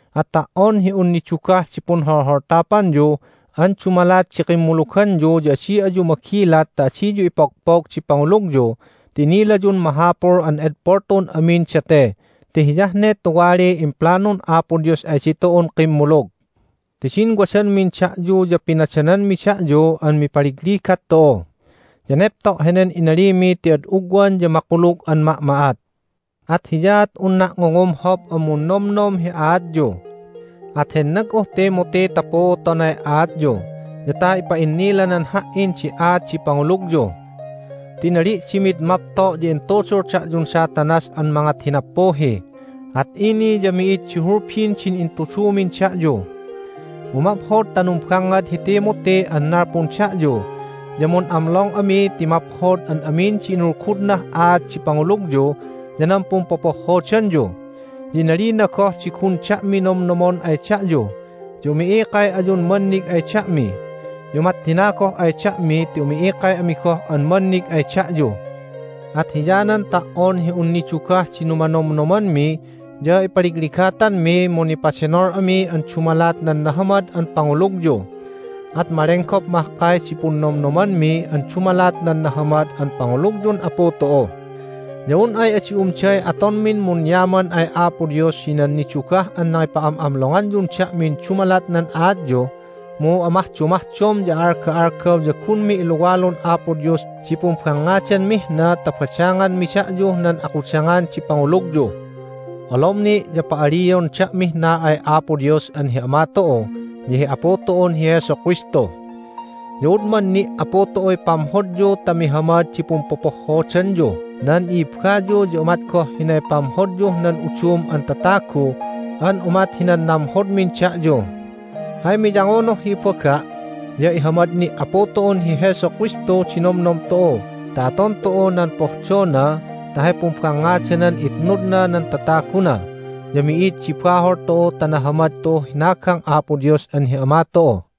At ta"on hi un nidugah di punholholtapanyu an dumalat di kimmuluganyu ya adi ayu magilat ta adiyu ipogpog di pangulugyu ti inilayun mahapul an edpol tu'un amin date ti hiyah ne tuwaliy implanun Apo Dios ay ditu'un kimmulug. Ti din wadanmin da'yu ya pinadananmi da'yu an mipaligligat tu'u. Ya nepto' henen inalimi ti ad ugwan ya makulug an ma'ma'at. At hiyaat unna' ngungumhop an munnomnom hi aatyu. At hennag'uh Timothy ta puutonay aatyu, ya ta ipa'innilanan ha"in di aat di pangulugyu. Ti inali' di mid mapto' ya intudul da'yun Satanas an mangat hi nappuhi, at ini ya mi'id di hulbin din intudumin da'yu! Mu maphod ta numbangngad hi Timothy an nalpun da'yu, ya mun'amlong ami ti maphod an amin di inulgudnah aat di pangulugyu ya nan pumpopohhodanyu. Ya inalina goh di gun da'mi nonomnomon ay da'yu, ya umi'ikay ayun mannig ay da'mi! Ya umat hina goh ay da'mi ti umi'ikay ami goh an mannig ay da'yu! At hiyanan ta"on hi un nidugah di numanomnomanmi ya ipaligligatanmi mu nipadenol ami an dumalat nan nahamad an pangulugyu. At malenggop mahkay di punnomnomanmi an dumalat nan nahamad an pangulugyun Apu tu'u. Ya un ay adi umday atonmin munyaman ay Apo Dios hinan nidugah an nangipa'am'amlonganyun da'min dumalat nan aatyu. Mu amahdomahdom ya a'alga'algaw ya gunmi iluwalun Apo Dios di pumbangngadanmih na ta badanganmi da'yuh nan akudangan di pangulugyu. Olom ni' ya pa'alion da'mih na ay Apo Dios an hi Ama tu'u ya hi Apu tu'un hi Jesu Kristu. Ya udman ni' Apu tu'uy pamhodyu ta mihamad di pumpopohhodanyuh nan i'ibbayu ya umat goh hinay pamhodyuh nan udum an tatagu an umat hinan namhodmin da'yu. Hay miyangunuh hi ibaga' ya ihamad ni' Apu tu'un hi Jesu Kristu di nomnom tu'u ta aton tu'u nan pohdona ta hay pumbangngadanan itnudna nan tataguna, ya mi'id di bahol tu'u ta nahamad tu'uh hinagang Apo Dios an hi Ama tu'u.